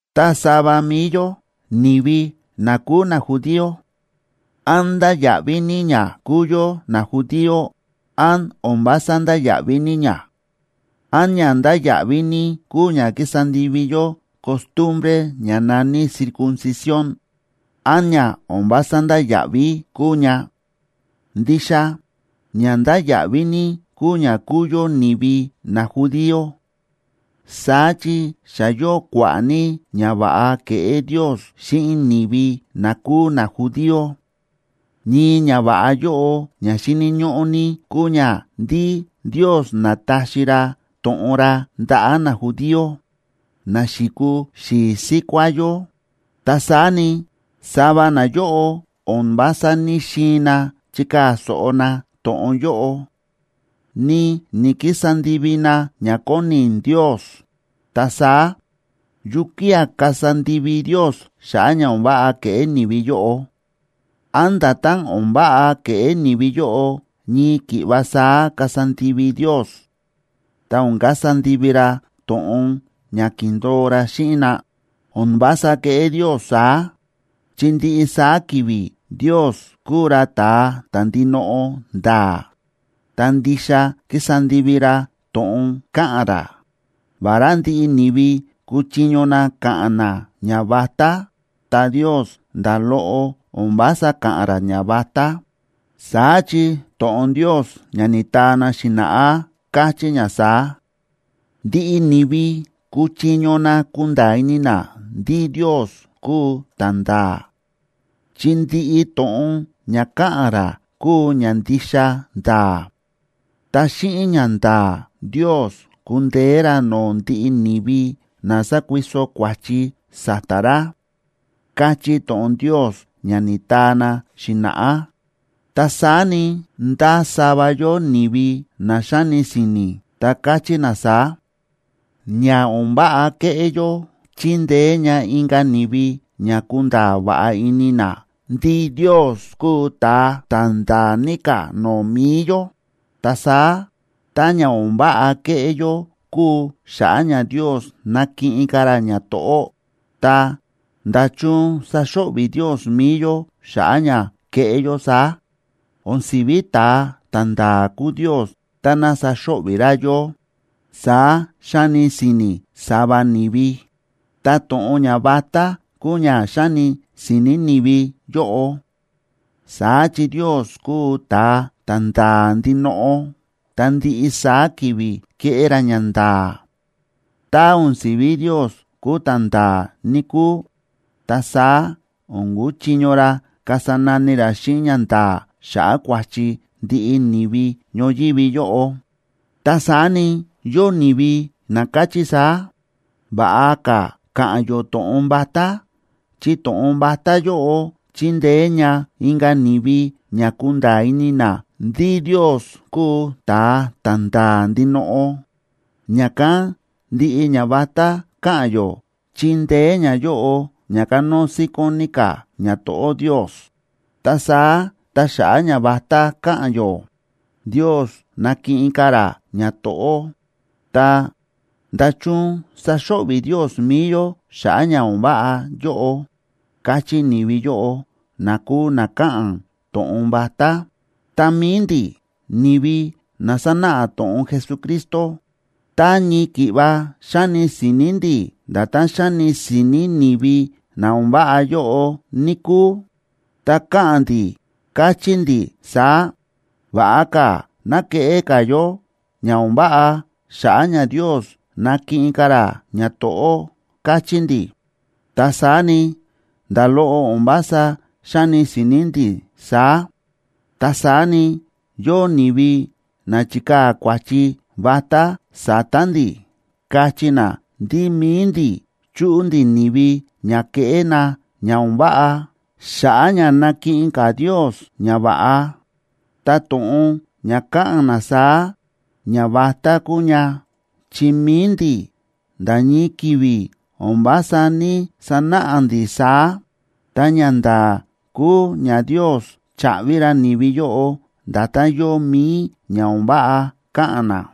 Ta sava mi̱i yó, ni̱vi na kúu najudío, ¿án ndáya̱ꞌví ní ña kúu yó najudío, án o̱n vása ndáya̱ꞌví ní ña? ¿Án ña ndáya̱ꞌví ní kúu ña ki̱sa ndivi yó costumbre ña na̱ní circuncisión, án ña o̱n vása ndáya̱ꞌví kúu ña? Ndixa ña ndáya̱ꞌví ní kúu ña kúu yó ni̱vi najudío. Saá chi xa yóo kua̱ꞌa̱ ní ñava̱ꞌa ke̱ꞌé Ndios xíꞌin ni̱vi na kúu najudío. Ñii ñava̱ꞌa yóꞌo ña xíni̱ ñóꞌó ní kúu ña ndí Ndios na̱taxi ra to̱ꞌon ra ndaꞌa̱ najudío, na xi̱kuu xi̱i̱ síkuá yó. Ta saá ni, sava nayóꞌo o̱n vása ní‑xiin na chikaa̱ so̱ꞌo na to̱ꞌon yóꞌo, ni ni̱‑kisa ndivi na ña kóni Ndios. Ta saá, ¿yukía̱ kasa ndivi Ndios xa̱ꞌa̱ ña o̱n váꞌa ke̱ꞌé ni̱vi yóꞌo? ¿Án nda̱tán o̱n váꞌa ke̱ꞌé ni̱vi yóꞌo, ñii ki̱ꞌva saá kasa ndivi Ndios, ta o̱n kasa ndivi ra to̱ꞌon ña ki̱ndo̱o ra xíꞌin na? ¡O̱n vása keꞌé Ndios saá! Chi ndiꞌi saá ki̱vi̱ Ndios kúu ra ta̱a ta̱ ndinoꞌo nda̱a̱, ta ndixa kísa ndivi ra to̱ꞌon káꞌa̱n ra. Vará ndiꞌi ni̱vi kúchiño na ka̱ꞌa̱n na ñavatá, ta Ndios nda̱ loꞌo o̱n vása káꞌa̱n ra ñavatá. Saá chi to̱ꞌon Ndios ña ni̱taa na xi̱na̱ꞌá káchí ña saá: Ndiꞌi ni̱vi kúchiño na kunda̱a̱ ini na ndí Ndios kúu ta̱nda̱a̱, chi ndiꞌi to̱ꞌon ña káꞌa̱n ra kúu ña ndixa nda̱a̱. Ta xíꞌin ñanda̱a̱ Ndios kúndeé ra no̱o̱ ndiꞌi ni̱vi na sákuiso kua̱chi sa̱ta̱ ra, káchí to̱ꞌon Ndios, ña ni̱taa na xi̱na̱ꞌá. Ta saá ni, ndásava yóo ni̱vi na xáni si̱ni̱, ta káchí na saá: “Ña o̱n váꞌa kéꞌé yó chíndeé ña inka̱ ni̱vi ña kunda̱a̱ va̱ꞌa ini na ndí Ndios kúu ta̱a ta̱ nda̱a̱ ní ka̱ no̱o̱ mi̱i yó. Ta saá, tá ña o̱n váꞌa kéꞌé yó kúu xa̱ꞌa̱ ña Ndios nakiꞌin ka̱ ra ñato̱ꞌó, ta, ¿nda̱chun saxo̱ꞌvi̱ Ndios mi̱i yó xa̱ꞌa̱ ña kéꞌé yó saá? O̱n si̱ví ta̱a ta̱nda̱a̱ kúu Ndios táná sáxo̱ꞌvi̱ ra yó”, saá xáni si̱ni̱ sava ni̱vi. Ta to̱ꞌon ñavatá kúu ña xáni si̱ni̱ ni̱vi yóꞌo. Saá chi Ndios kúu ta̱a ta̱nda̱a̱ ndinoꞌo, ta ndiꞌi saá ki̱vi̱ kéꞌé ra ñanda̱a̱. Tá o̱n si̱vi Ndios kúu ta̱nda̱a̱, níkúu, ta saá o̱n kuchiño ra kasa nani ra xíꞌin ñanda̱a̱ xa̱ꞌa̱ kua̱chi ndiꞌi ni̱vi ñoyívi yóꞌo. Ta saá ni, yóo ni̱vi na káchí saá: “Va̱ꞌa ka̱ ka̱ꞌa̱n yó to̱ꞌon vatá, chi to̱ꞌon vatá yóꞌo chíndeé ña inka̱ ni̱vi ña kunda̱a̱ ini na ndí Ndios kúu ta̱a ta̱nda̱a̱ ndinoꞌo. Ña̱kán ndiꞌi ñavatá káꞌa̱n yó, chíndeé ñayóꞌo ña kanóo síkón ní ka̱ ñato̱ꞌó Ndios. Ta saá tá xa̱ꞌa̱ ñavatá káꞌa̱n yó, Ndios nákiꞌin ka̱ ra ñato̱ꞌó, ta, ¿nda̱chun sáxo̱ꞌvi̱ Ndios mi̱i yó xa̱ꞌa̱ ña o̱n váꞌa yóꞌo?”, káchí ni̱vi yóꞌo, na kúu na káꞌa̱n to̱ꞌon vatá. Ta mi̱i ndi̱, ni̱vi na sánáꞌa to̱ꞌon Jesucristo, tá ñii ki̱ꞌva xáni si̱ni̱ ndi̱ nda̱tán xáni si̱ni̱ ni̱vi na o̱n váꞌa yóꞌo, níkúu, ta ka̱ꞌa̱n ndi̱, kachí ndi̱ saá: “Va̱ꞌa ka̱ ná keꞌé ka̱ yó ña o̱n váꞌa, xa̱ꞌa̱ ña Ndios nakiꞌin ka̱ ra ñato̱ꞌó”, kachí ndi̱. Ta saá ni, nda̱ loꞌo o̱n vása xáni si̱ni̱ ndi̱ saá. Ta saá ni, yóo ni̱vi na chíkaa̱ kua̱chi vatá sa̱ta̱ ndi̱, káchí na ndí mi̱i ndi̱ chúꞌu ndi̱ ni̱vi ña keꞌé na ña o̱n váꞌa, xa̱ꞌa̱ ña nakiꞌin ka̱ Ndios ñava̱ꞌa. Ta to̱ꞌon ña káꞌa̱n na saá, ñavatá kúu ña, chi mi̱i ndi̱, nda̱ ñii ki̱vi̱ o̱n vása ní‑sanáꞌa ndi̱ saá. Ta ñanda̱a̱ kúu ña Ndios chaꞌvi ra ni̱vi yóꞌo nda̱tán yóo mi̱i ña o̱n váꞌa káꞌa̱n na.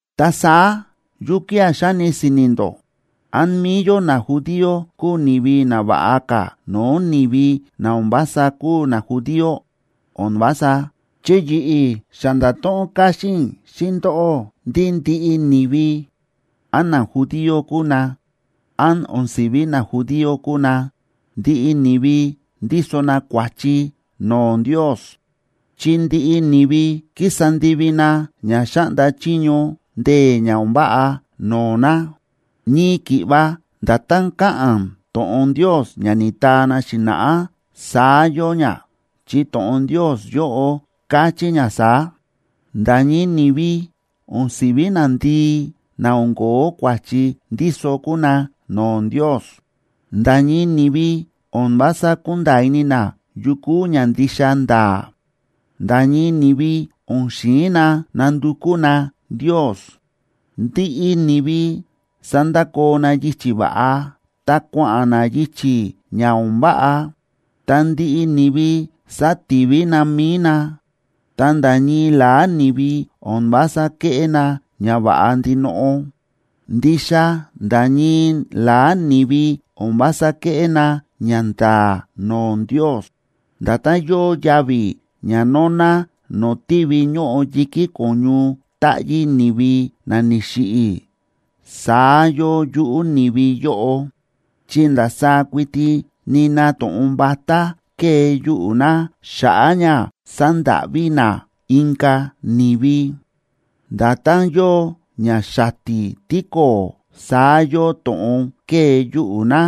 Ta saá, ¿yukía̱ xáni si̱ni̱ ndó? ¿Án mi̱i yó najudío kúu ni̱vi na va̱ꞌa ka̱ no̱o̱ ni̱vi na o̱n vása kúu najudío? ¡O̱n vása!, chi yi̱ꞌi̱ xa nda̱to̱ꞌon káxín i̱ xíꞌin ndóꞌó ndí ndiꞌi ni̱vi, án najudío kúu na, án o̱n si̱ví najudío kúu na, ndiꞌi ni̱vi ndíso na kua̱chi no̱o̱ Ndios, chi ndiꞌi ni̱vi kísa ndivi na ña xáꞌnda chiño ndee̱ ña o̱n váꞌa no̱o̱ na. Ñii ki̱ꞌva nda̱tán káꞌa̱n to̱ꞌon Ndios ña ni̱taa na xi̱na̱ꞌá, saá yóo ña, chi to̱ꞌon Ndios yóꞌo káchí ña saá: Nda̱ ñii ni̱vi o̱n si̱ví nandii na o̱n ko̱ó kua̱chi ndíso kúu na no̱o̱ Ndios. Nda̱ ñii ni̱vi o̱n vása kúnda̱a̱ ini na yu kúu ña ndixa nda̱a̱. Nda̱ ñii ni̱vi o̱n xi̱in na nandukú na Ndios. Ndiꞌi ni̱vi sa̱ndakoo na yichi̱ va̱ꞌa, ta kua̱ꞌa̱n na yichi̱ ña o̱n váꞌa, ta ndiꞌi ni̱vi sa̱tivi na mi̱i na, ta nda̱ ñii la̱á ni̱vi o̱n vása kéꞌé na ñava̱ꞌa ndinoꞌo, ndixa nda̱ ñii la̱á ni̱vi o̱n vása kéꞌé na ñanda̱a̱ no̱o̱ Ndios. Nda̱tán yóo yavi̱ ña nóná no̱o̱ tívi ñóꞌo yi̱kí ko̱ñu táꞌyí ni̱vi na ni̱xiꞌi̱, saá yóo yuꞌu̱ ni̱vi yóꞌo. Chi ndasaá kuiti nina to̱ꞌon vatá kée yuꞌu̱ na xa̱ꞌa̱ ña sandáꞌví na inka̱ ni̱vi. Nda̱tán yóo ña xati̱ tíko̱o̱, saá yóo to̱ꞌon kée yuꞌu̱ na.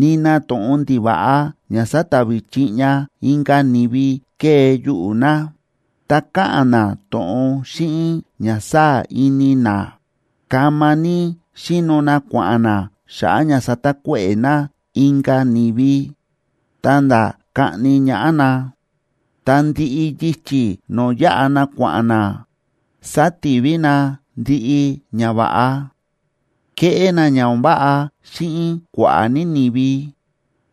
Nina to̱ꞌon ndiva̱ꞌa ña satavi chiꞌña inka̱ ni̱vi kée yuꞌu̱ na, ta káꞌa̱n na to̱ꞌon xíꞌin ña sáa̱ ini na. Kama ní xíno na kua̱ꞌa̱n na xa̱ꞌa̱ ña satakuéꞌe̱ na inka̱ ni̱vi, ta̱nda̱ kaꞌni ñaꞌá na. Ta ndiꞌi yichi̱ no̱o̱ yáꞌa na kua̱ꞌa̱n na, sátivi na ndiꞌi ñava̱ꞌa; kéꞌé na ña o̱n váꞌa xíꞌin kua̱ꞌa̱ ní ni̱vi,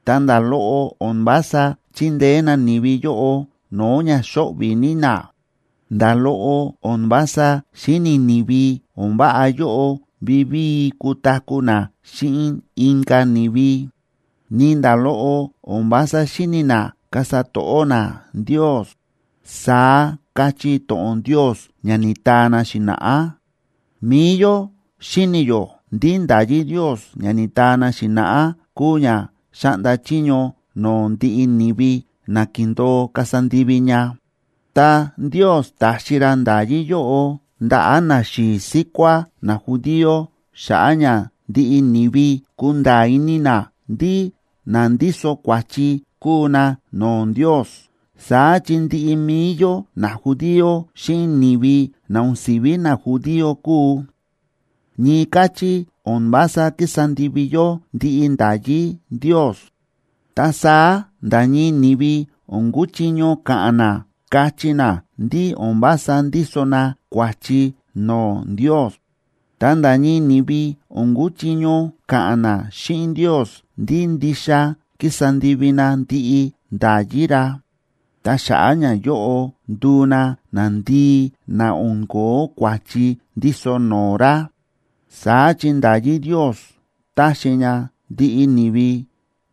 ta nda̱ loꞌo o̱n vása chíndeé na ni̱vi yóꞌo no̱o̱ ña xóꞌvi̱ ní na. Nda̱ loꞌo o̱n vása xíni̱ ni̱vi o̱n váꞌa yóꞌo vivíi kutaku̱ na xíꞌin inka̱ ni̱vi. Ni nda̱ loꞌo o̱n vása xíni̱ na kasa to̱ꞌó na Ndios, saá káchí to̱ꞌon Ndios ña ni̱taa na xi̱na̱ꞌá. Mi̱i yó xíni̱ yó ndí nda̱yí Ndios ña ni̱taa na xi̱na̱ꞌá kúu ña xáꞌnda chiño no̱o̱ ndiꞌi ni̱vi na ki̱ndo̱o kasa ndivi ña. Ta Ndios ta̱xi ra nda̱yí yóꞌo ndaꞌa̱ naxi̱i̱ síkuá najudío xa̱ꞌa̱ ña ndiꞌi ni̱vi kunda̱a̱ ini na ndí na ndíso kua̱chi kúu na no̱o̱ Ndios. Saá chi ndiꞌi mi̱i yó najudío xíꞌin ni̱vi na o̱n si̱ví najudío kúu, ñii káchí o̱n vása kísa ndivi yó ndiꞌi nda̱yí Ndios. Ta saá nda̱ ñii ni̱vi o̱n kúchiño ka̱ꞌa̱n na kachí na ndí o̱n vása ndíso na kua̱chi no̱o̱ Ndios. Ta nda̱ ñii ni̱vi o̱n kúchiño ka̱ꞌa̱n na xíꞌin Ndios ndí ndixa ki̱sa ndivi na ndiꞌi nda̱yí ra, ta xa̱ꞌa̱ ñayóꞌo ndu̱u na nandii na o̱n ko̱ó kua̱chi ndíso no̱o̱ ra. Saá chi nda̱yí Ndios táxi ña ndiꞌi ni̱vi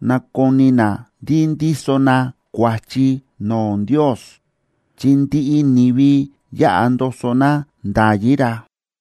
nakoni na ndí ndíso na kua̱chi no̱o̱ Ndios, chi ndiꞌi ni̱vi yáꞌa ndoso na nda̱yí ra.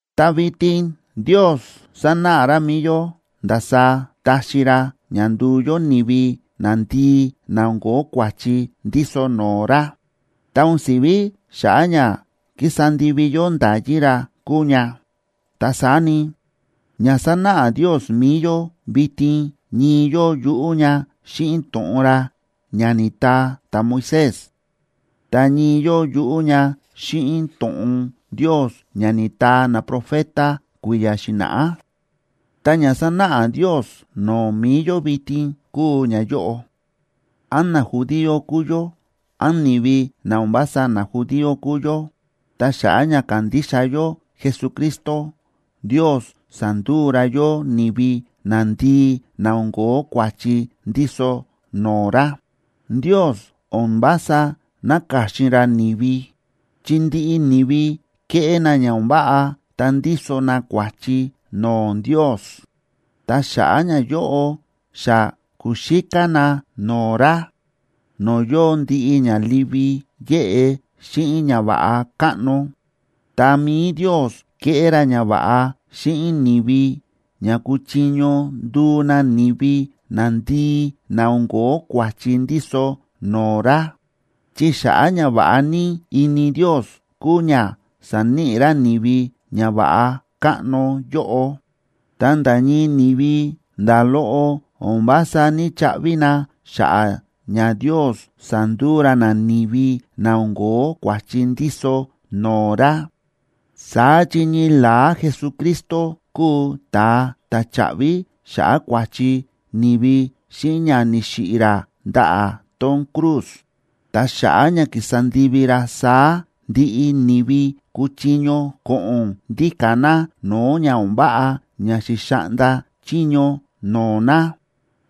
Ta vitin Ndios sánáꞌa ra mi̱i yó ndasaá táxi ra ña nduu yó ni̱vi nandii na o̱n ko̱ó kua̱chi ndíso no̱o̱ ra, ta o̱n si̱ví xa̱ꞌa̱ ña kísa ndivi yó nda̱yí ra kúu ña. Ta saá ni, ña sánáꞌa Ndios mi̱i yó vitin ñii yóo yuꞌú ña xíꞌin to̱ꞌon ra ña ni̱taa ta̱Moisés, ta ñii yóo yuꞌú ña xíꞌin to̱ꞌon Ndios ña ni̱taa naprofeta kui̱ya̱ xi̱na̱ꞌá. Ta ña sánáꞌa Ndios no̱o̱ mi̱i yó vitin kúu ñayóꞌo: án najudío kúu yó, án ni̱vi na o̱n vása najudío kúu yó, ta xa̱ꞌa̱ ña kándixa yó Jesucristo, Ndios sánduu ra yó ni̱vi nandii na o̱n ko̱ó kua̱chi ndíso no̱o̱ ra. Ndios o̱n vása náka̱xin ra ni̱vi, chi ndiꞌi ni̱vi kéꞌé na ña o̱n váꞌa ta ndíso na kua̱chi no̱o̱ Ndios, ta xa̱ꞌa̱ ñayóꞌo xa ku̱xíká na no̱o̱ ra, no̱o̱ yóo ndiꞌi ña livi yéꞌe xíꞌin ñava̱ꞌa káꞌno. Ta mi̱i Ndios ke̱ꞌé ra ñava̱ꞌa xíꞌin ni̱vi ña kuchiño nduu na ni̱vi nandii na o̱n ko̱ó kua̱chi ndíso no̱o̱ ra. Chi xa̱ꞌa̱ ñava̱ꞌa ní ini Ndios, kúu ña sa̱níꞌi ra ni̱vi ñava̱ꞌa káꞌno yóꞌo, ta nda̱ ñii ni̱vi, nda̱ loꞌo o̱n vása ní‑chaꞌvi na xa̱ꞌa̱ ña Ndios sa̱nduu ra na ni̱vi na o̱n ko̱ó kua̱chi ndíso no̱o̱ ra. Saá chi ñii la̱á Jesucristo kúu ta̱a ta̱ cha̱ꞌvi xa̱ꞌa̱ kua̱chi ni̱vi xíꞌin ña ni̱xiꞌi̱ ra ndaꞌa̱ tón cruz. Ta xa̱ꞌa̱ ña ki̱sa ndivi ra saá, ndiꞌi ni̱vi kúchiño ko̱ꞌo̱n ndíka̱ na no̱o̱ ña o̱n váꞌa ña xi̱xaꞌnda chiño no̱o̱ na.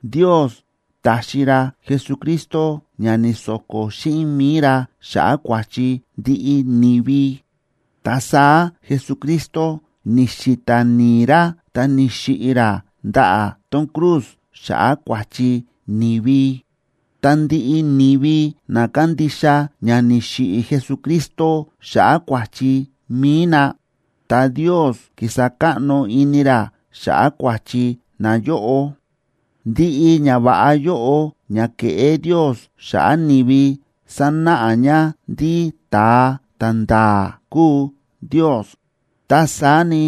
Ndios ta̱xi ra Jesucristo ña ni̱so̱ko̱ xíꞌin mi̱i ra xa̱ꞌa̱ kua̱chi ndiꞌi ni̱vi. Ta saá Jesucristo ni̱xi̱ta̱ ni̱i̱ ra ta ni̱xiꞌi̱ ra ndaꞌa̱ tón cruz xa̱ꞌa̱ kua̱chi ni̱vi. Ta ndiꞌi ni̱vi na kándixa ña ni̱xiꞌi̱ Jesucristo xa̱ꞌa̱ kua̱chi mi̱i na, ta Ndios kísa káꞌno ini ra xa̱ꞌa̱ kua̱chi nayóꞌo. Ndiꞌi ñava̱ꞌa yóꞌo ña ke̱ꞌé Ndios xa̱ꞌa̱ ni̱vi sánáꞌa ña ndí ta̱a ta̱nda̱a̱ kúu Ndios. Ta saá ni,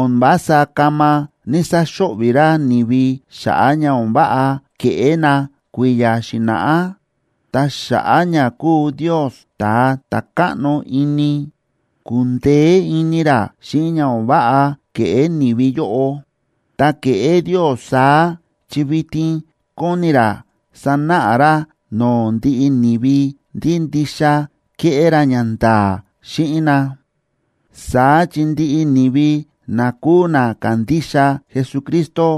o̱n vása kama ni̱‑saxo̱ꞌvi̱ ra ni̱vi xa̱ꞌa̱ ña o̱n váꞌa ke̱ꞌé na kui̱ya̱ xi̱na̱ꞌá, ta xa̱ꞌa̱ ña kúu Ndios ta̱a ta̱ káꞌno ini, ku̱ndeé ini ra xíꞌin ña o̱n váꞌa ke̱ꞌé ni̱vi yóꞌo. Ta ke̱ꞌé Ndios saá, chi vitin kóni ra sanáꞌa ra no̱o̱ ndiꞌi ni̱vi ndí ndixa kéꞌé ra ñanda̱a̱ xíꞌin na. Saá chi ndiꞌi ni̱vi na kúu na kándixa Jesucristo,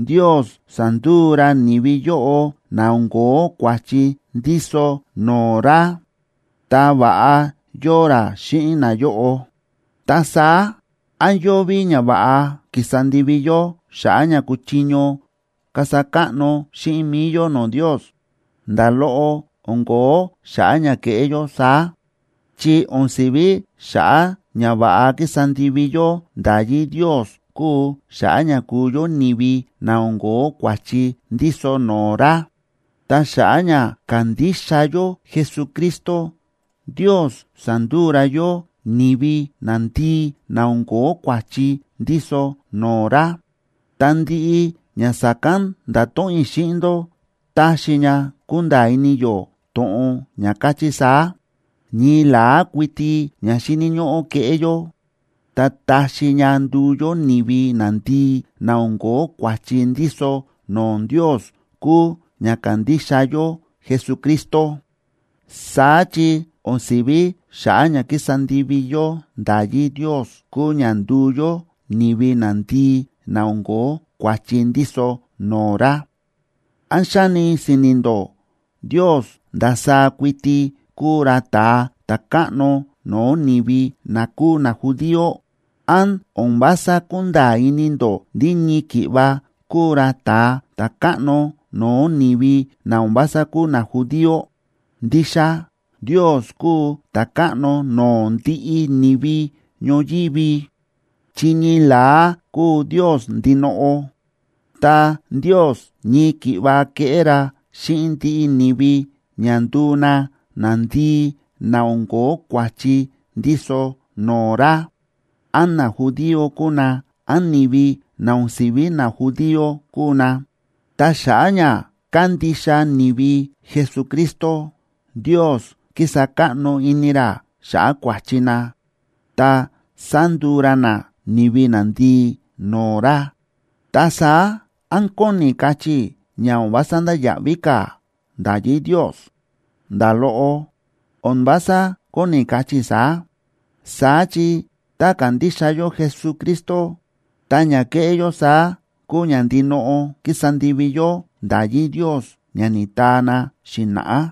Ndios sánduu ra ni̱vi yóꞌo na o̱n ko̱ó kua̱chi ndíso no̱o̱ ra, ta va̱ꞌa yóo ra xíꞌin nayóꞌo. Ta saá, ¿án yóo ví ñava̱ꞌa kísa ndivi yó xa̱ꞌa̱ ña kuchiño kasa káꞌno xíꞌin mi̱i yó no̱o̱ Ndios? ¡Nda̱ loꞌo, o̱n ko̱ó xa̱ꞌa̱ ña keꞌé yó saá!, chi o̱n si̱ví xa̱ꞌa̱ ña va̱ꞌa kísa ndivi yó nda̱yí Ndios kúu xa̱ꞌa̱ ña kúu yó ni̱vi na o̱n ko̱ó kua̱chi ndíso no̱o̱ ra. Ta xa̱ꞌa̱ ña kándixa yó Jesucristo, Ndios sa̱nduu ra yó ni̱vi nandii na o̱n ko̱ó kua̱chi ndíso no̱o̱ ra. Ta ndiꞌi ña sa̱kán nda̱to̱ꞌon i̱ xíꞌin ndó taxi ña kunda̱a̱ ini yó to̱ꞌon ña káchí saá: Ñii la̱á kuiti ña xíni̱ ñóꞌó keꞌé yó, ta taxi ña nduu yó ni̱vi nandii na o̱n ko̱ó kua̱chi ndíso no̱o̱ Ndios kúu ña kandixa yó Jesucristo. Saá chi o̱n si̱ví xa̱ꞌa̱ ña kísa ndivi yó nda̱yí Ndios kúu ña nduu yó ni̱vi nandii na o̱n ko̱ó kua̱chi ndíso no̱o̱ ra. ¿Án xáni si̱ni̱ ndó Ndios ndasaá kuiti kúu ra ta̱a ta̱káꞌno no̱o̱ ni̱vi na kúu najudío? ¿Án o̱n vása kúnda̱a̱ ini ndó ndí ñii ki̱ꞌva kúu ra ta̱a ta̱káꞌno no̱o̱ ni̱vi na o̱n vása kúu najudío? Ndixa Ndios kúu ta̱káꞌno no̱o̱ ndiꞌi ni̱vi ñoyívi. Chi ñii la̱á kúu Ndios ndinoꞌo, ta Ndios ñii ki̱ꞌva kéꞌé ra xíꞌin ndiꞌi ni̱vi ña nduu na nandii na o̱n ko̱ó kua̱chi ndíso no̱o̱ ra, án najudío kúu na, án ni̱vi na o̱n si̱ví najudío kúu na. Ta xa̱ꞌa̱ ña kándixa ni̱vi Jesucristo, Ndios kísa káꞌno ini ra xa̱ꞌa̱ kua̱chi na, ta sánduu ra na ni̱vi nandii no̱o̱ ra. Ta saá, ¿án kóni kachí i̱ ña o̱n vása ndáya̱ꞌví ka̱ nda̱yí Ndios? ¡Nda̱ loꞌo, o̱n vása kóni kachí i̱ saá! Saá chi tá kándixa yó Jesucristo, ta ña kéꞌé yó saá kúu ña ndinoꞌo kísa ndivi yó nda̱yí Ndios ña ni̱taa na xi̱na̱ꞌá.